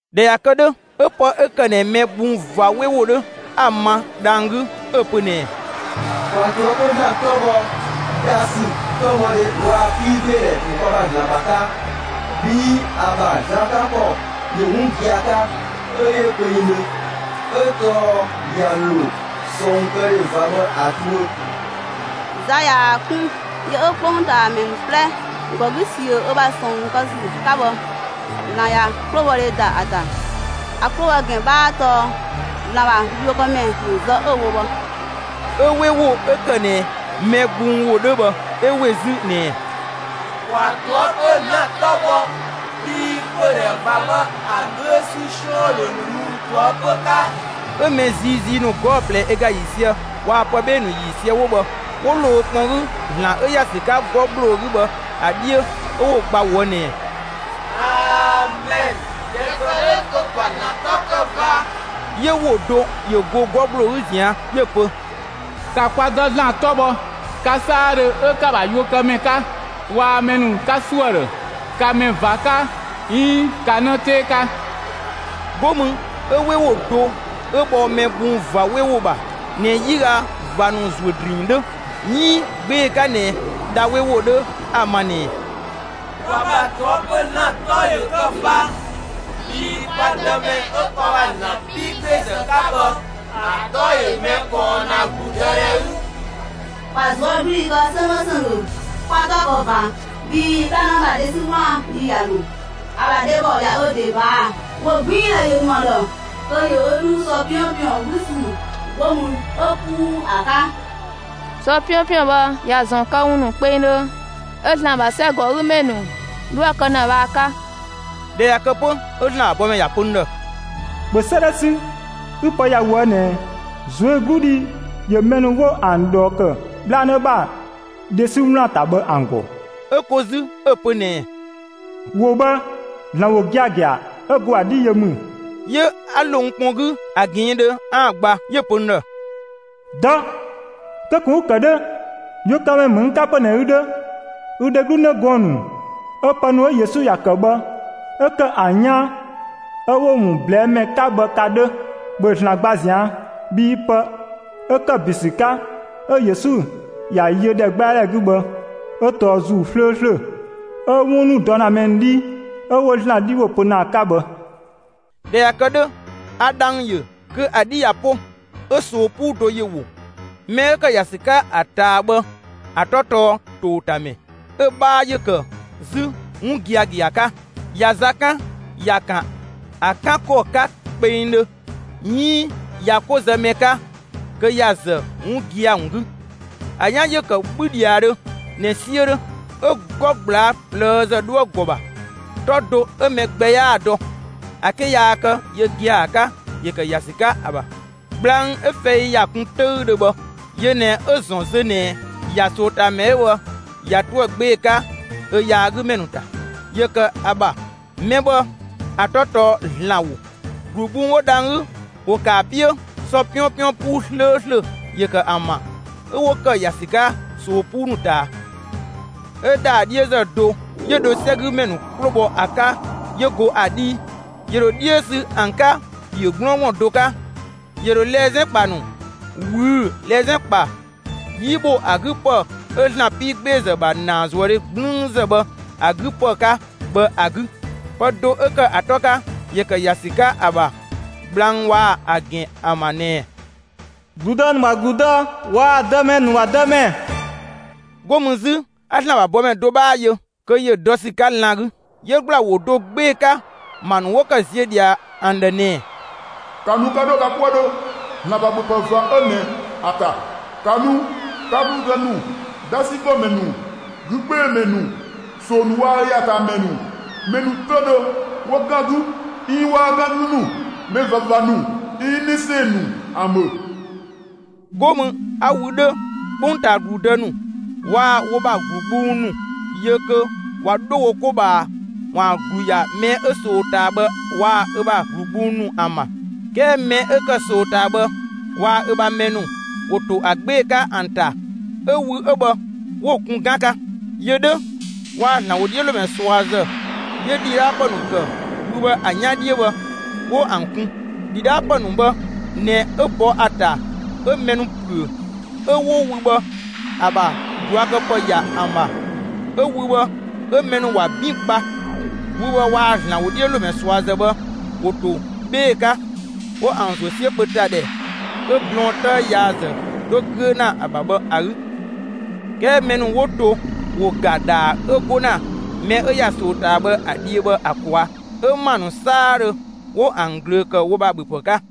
꞊Dhɛ ꞊ya kë 'dhö, 'ö pë 'ö ‑kë ꞊nɛ mɛ gbung ꞊va 'we ‑wo 'dhö 'a‑ ‑ma dhang‑ 'gü, 'ö‑ pö ꞊nɛɛ: «‑Kwa ꞊toëpö ‑Zlan 'tɔ bhɔ! Dhasü, 'tɔbhɔdhe waa‑ 'piigbeedhɛ ‑wo kwa ‑bha ‑Zlan ‑bha 'ka! Bhii ‑a ‑bha za 'kan ‑kɔ ‑yö 'wun gia‑ 'ka 'ö 'yö kpengdhö! 'Ö tɔɔ ꞊ya ‑lo ꞊sɔɔnkëdhe ꞊va bhë ‑a tuö. Za ꞊yaa‑ 'kun, yö 'ö 'kpongtaamɛ 'plɛ ‑gɔ 'gü ꞊siö ö ‑bha ꞊sɔɔn kë ‑sü 'ka bhë, ‑Zlan ꞊ya 'klobhɔdhe ‑da ‑a ‑ta. ‑A 'klo ‑bhɔ ‑gɛn 'bhaa 'ö tɔɔ ‑Zlan ‑bha yuökëmɛ ‑nu zë 'ö‑ wo bhë.» 'Ö 'we ‑wo 'ö ‑kë ꞊nɛ mɛ gbung ‑wo 'dhö bhë 'ö ‑we 'zü ꞊nɛɛ: «‑Kwa ꞊toëpö ‑Zlan 'tɔ bhɔ, bhii pödhɛ ꞊va bhë ‑a 'güö ‑sü 'siɔn ‑yö ‑dho ꞊luu' ꞊toëpö 'ka!» 'Ö mɛ ziizii ‑nu 'gɔɔ‑ ꞊plɛ ö ga ‑yiisië waa‑ pë 'bhee‑ ‑nu ‑yiisië 'wo bhë 'wo ‑lo wo kpɔn 'gü ‑Zlan 'ö ‑ya ‑sü 'ka 'gɔ ‑gbloo 'gü bhë ‑a 'dhiö 'ö 'wo‑ gba ꞊woë' ꞊nɛɛ: «Amɛn! ꞊Dhɛ ‑kë 'dhö kö ‑kwa ‑Zlan 'tɔ kë ꞊va!» 'Yö ‑wo do ‑yö go 'gɔ ‑gbloo 'gü ꞊zian' 'yö‑ pö: «‑Ka kwa Dë ‑Zlan 'tɔ bhɔ, ka 'saadhö 'ö 'ka‑ ‑bha yuökëmɛ 'ka waa‑ mɛ ‑nu 'ka ‑suö ‑a ‑dhë, ka mɛ ꞊va 'ka 'iin ka 'në 'tee 'ka!» 'Go mü 'ö 'we ‑wo do 'ö bhɔ mɛ gbung ꞊va 'we ‑wo ‑bha ꞊nɛ 'yiga ꞊va ‑nu ‑zuö ‑drinng 'dhö, 'iin 'gbee‑ 'ka ꞊nɛ dha 'we ‑wo 'dhö 'a‑ ma ꞊nɛɛ: «Kwa ‑bha ꞊toëpö ‑Zlan 'tɔ ‑yö kë ꞊va! Bhii kwa Dëmɛ 'ö kwa ‑bha ‑Zlan 'piigbeezë 'ka bhë ‑a 'tɔ ‑yö mɛ ꞊kɔɔn ‑na ‑gludëdhɛ 'gü! ‑Kwa ꞊zuögludhi kë 'sönggö ‑sönggö, 'kwa‑ 'tɔ kë ꞊va. Bhii 'bhlanë ‑bha dhe 'sü 'wlaan‑ yi ꞊ya ‑lo. ‑A ‑bha dhebɔ ꞊ya ö ‑de ꞊baa'‑. ‑Wogbiindhɛ ‑yö ‑nu ‑a ‑dhë, kö ‑yö ö 'dhu sɔ 'piɔnpiɔn, 'bhü ‑sü 'go mü 'ö 'puu ‑a 'ka. Sɔ 'piɔnpiɔn bhë ‑ya ‑zɔn këwun ‑nu kpengdhö 'ö ‑Zlan ‑bha 'sɛgɔgümɛ ‑nu 'dho ‑a kë ‑na bhë ‑a 'ka.» ꞊Dhɛ ꞊ya kë 'pö, 'ö ‑Zlan ‑bha bɔmɛ ‑ya pö n ‑dhë: «‑Bhö 'sëëdhɛ 'sü, 'ü pë ‑ya ꞊woë' ꞊nɛɛ: ꞊Zuögludhi ‑yö mɛ ‑nu 'wo ‑an ꞊dhɔɔ ‑kë 'bhlanë ‑bha dhe 'sü 'wlaan‑ ‑ta bhë ‑an ‑gɔ.» 'Ö ko 'zü 'ö‑ pö ꞊nɛɛ: «‑Wo bhë, ‑Zlan ‑wo giagia 'ö go ‑a 'dhii yö ‑mü.» 'Yö 'a ‑lo n kpɔn 'gü ‑a ꞊gɛɛndhö kö 'aan‑ gba, 'yö‑ pö n ‑dhë: «Dɔ! Kö ꞊kun 'ü‑ ‑kë 'dhö! Yuökëmɛ ‑mü n 'ka 'pö ꞊nɛ ü 'dhö, ü dheglu 'në gɔɔn‑ ‑nu 'ö pë ‑nu 'ö Yesu ‑ya ‑kë bhë 'ö ‑kë ‑an 'yaan 'ö 'wo‑ ‑wun ꞊blɛɛ'‑ ‑mɛ 'ka bhë ka 'dhö. ‑Bhö ‑Zlan gba ꞊zian'!» Bhii pë 'ö ‑kë ‑bin ‑sü 'ka 'ö Yesu ‑ya yö ‑dhɛgbɛadhɛ 'gü bhë 'ö tɔɔ ‑Zuu 'slööslö 'ö 'wun ‑nu dɔ ‑na mɛ ‑nu 'dhii 'ö 'wo ‑Zlan 'dhi ‑wo pö ‑na ‑a 'ka bhë. ꞊Dhɛ ꞊ya kë 'dhö, a dhang‑ ‑yö kö ‑a 'dhi ꞊ya 'po, 'ö ꞊soo 'puu do ‑yö ‑wo. Mɛ 'ö ‑kë ‑ya ‑sü 'ka ‑a ꞊taa bhë ‑a 'tɔ tɔɔ «‑Towotamɛ»; 'ö‑ 'bhaa ‑yö ‑kë 'zü «'Wungiagia» 'ka; ꞊ya za 'kan, ‑ya ‑kan ‑a 'kan ‑kɔ 'ka kpengdhö; 'iin ꞊ya 'ko zë mɛ 'ka, kö ‑ya ‑zë 'wun gia‑ ‑wun 'gü. ‑A 'yan ‑yö ‑kë 'bhü ‑dhiadhö ꞊nɛ 'siö 'dhö. 'Ö 'gɔ ꞊gblaa' ꞊plëëzë 'dhoë‑ ‑gɔ ‑bha. 'Tɔ do 'ö mɛ gbɛ 'yaa‑ dɔ ‑a 'ke yaa kë yö gia‑ ‑a 'ka ‑yö ‑kë ‑ya ‑sü 'ka ‑a ‑bha. Gblang 'ö fɛi ‑ya kun 'töüdhö bhë, (yö ꞊nɛ 'ö‑ ‑zɔn zö ꞊nɛ ‑ya ꞊soo ꞊taa ‑mɛ 'ö bhë ꞊ya 'toë‑ 'gbee‑ 'ka ö yaagümɛ ‑nu ‑ta) ‑yö ‑kë ‑a ‑bha. Mɛ bhë ‑a 'tɔ tɔɔ ‑Zlan ‑wo. ‑Glu gbung 'wo dhang‑ 'gü ‑wo ‑kë ‑a 'piö; sɔ 'piɔnpiɔn 'puu 'slööslö ‑yö ‑kë ‑an ‑bha 'ö 'wo ‑kë ‑ya ‑sü 'ka ꞊soo 'puu ‑nu ꞊taa. 'Ö ‑dhaa 'dhiözë do 'yö dho 'sɛgümɛ ‑nu 'klo bhɔ ‑a 'ka 'yö go ‑a 'dhii. ‑Yö ‑dho 'dhiö sü ‑an 'ka ‑piö 'gblɔɔngblɔn do 'ka; 'yö dho lɛzɛn ‑kpa ‑nu ꞊wüü'‑ lɛzɛn ‑kpa 'yi ‑bho ‑a 'gü ‑pë 'ö ‑Zlan 'piigbeezë ‑bha ‑naazuëdhe 'gblüünzë bhë ‑a 'gü ‑pë 'ka bhë ‑a 'gü. Pë do 'ö ‑kë ‑a 'tɔ 'ka ‑yö ‑kë ‑ya ‑sü 'ka ‑a ‑bha gblang waa‑ ‑a ‑gɛn ‑an ‑bha ꞊nɛɛ: «‑Gludë ‑nu ‑bha ‑Gludë waa‑ dëmɛ ‑nu ‑bha Dëmɛ». 'Go mü 'zü 'a ‑Zlan ‑bha bɔmɛ do 'bhaa yö kö ‑yö ‑dɔ ‑sü 'ka lan‑ 'gü. 'Yö ‑gbla ‑wo do 'gbee‑ 'ka ‑ma ‑nu 'wo ‑kë ziö ꞊dhia ‑an ‑dhë ꞊nɛɛ: «‑Ka nu 'ka 'dho ka 'kuëdhö ‑Zlan ‑bha ‑bhöpë ꞊va 'ö ꞊nɛ ‑a ‑ta! ‑Ka nu, 'ka ‑gludë ‑nu, 'dhasi ‑nu ‑gɔmɛ ‑nu, 'gü 'gbee‑ ‑mɛ ‑nu, ꞊soo ‑nu waa‑ ö ‑ya ‑a ꞊taa ‑mɛ ‑nu, mɛ ‑nu 'töüdhö 'wo 'gan 'gü 'iin 'waa 'gan 'gü ‑nu, mɛ ꞊vava ‑nu 'iin 'në 'sɛɛn‑ ‑nu ‑an ‑bhö!» 'Go mü 'a wü 'dhö, 'kpongtaa ‑gludë ‑nu waa‑ wo ‑bha ‑glu gbung ‑nu yö kö ꞊wa 'dho wo 'ko ꞊bhaa ‑waan ‑glu ‑ya mɛ 'ö ꞊soo ꞊taa bhë waa‑ ö ‑bha ‑glu gbung ‑nu ‑an ‑bha. 'Kɛɛ mɛ 'ö ‑kë ꞊soo ꞊taa bhë waa‑ ö ‑bha mɛ ‑nu ‑wo ‑to ‑a 'gbee‑ 'ka ‑an ‑ta 'ö wü 'ö bhë 'wo‑ kun 'gan 'ka. Yö 'dhö waa‑ ‑Zlan ‑wodhiölomɛ ꞊suazë 'yö ‑dhidhaapë ‑nu ‑kë wü bhë ‑a 'yan 'dhiö bhë 'wo ‑an kun. ‑Dhidhaapë ‑nu bhë ꞊nɛ 'ö bɔ ‑a ‑ta 'ö mɛ ‑nu ‑püö; 'ö 'wo wü bhë ‑a ‑bha ꞊duakëpë ‑ya ‑an ‑bha; 'ö wü bhë 'ö mɛ ‑nu ‑wa 'bin gba. Wü bhë waa‑ ‑Zlan ‑wodhiölomɛ ꞊suazë bhë ‑wo ‑to 'bhee‑ 'ka 'wo ‑an ‑zuö 'siö kpö ‑ta ‑dhɛ 'ö blɔɔn 'tëë yaazë 'dho 'güö ‑na ‑a ‑bha bhë ‑a 'gü. 'Kɛɛ mɛ ‑nu 'wo to ‑wo ‑ga ‑dhaa 'ö 'go ‑na mɛ 'ö ‑ya ꞊soo ꞊taa bhë ‑a dhiö bhë ‑a ꞊kwaa'; 'ö ‑ma ‑nu 'saadhö ‑wo ‑an ꞊glöö ‑kë wo ‑bha ‑bhöpë 'ka.